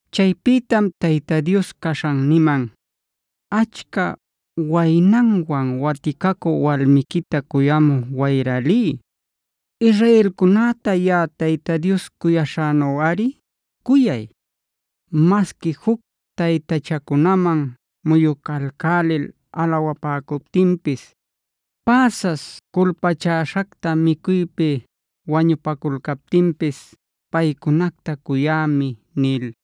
Chaypïtam Tayta Dios caśhan niman: “Achca waynanwan waticacü walmiquita cuyamü wayra liy. Israelcunäta yaꞌa Tayta Dios cuyaśhänuꞌari cuyay. Masqui juc taytachacunaman muyucalcälil alawapäcuptinpis, päsas culpachäśhacta micuypi wañupaculcaptinpis paycunacta cuyämi” nil.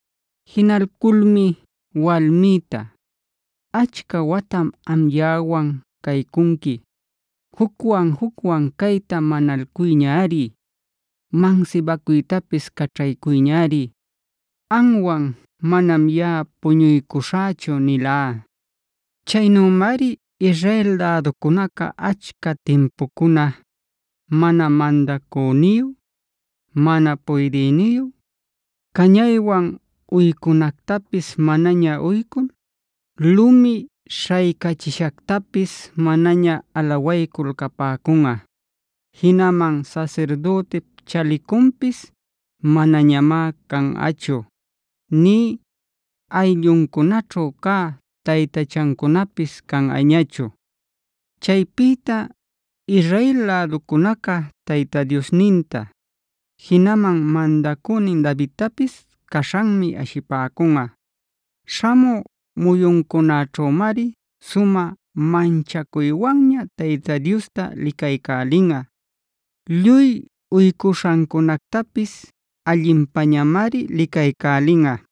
Jinalculmi walmïta: “Achca watam am yaꞌawan caycunqui. Jucwan-jucwan cayta manalcuyñari; mansibacuytapis caćhaycuyñari. Amwan manam yaꞌa puñuycuśhächu”b nilá. Chaynümari Israel läducunaca achca timpucuna mana mandacüniyu, mana puydïniyu, cañaywan uycunactapis manaña uycul, lumi śhaycächishactapis manaña alawaycul capäcunꞌa; jinaman sasirdütip chalicunpisc manañamá canꞌachu, nï ayllucunaćhu cä taytachacunapis canꞌañachu. Chaypïta Israel läducunaca Tayta Diosninta, jinaman mandacünin Davidtapis caśhanmi ashipäcunꞌa. Śhamü muyuncunäćhümari sumä manchacuywanña Tayta Diosta licaycälinꞌa; lluy uycuśhancunactapis allinpañamari licaycälinꞌa.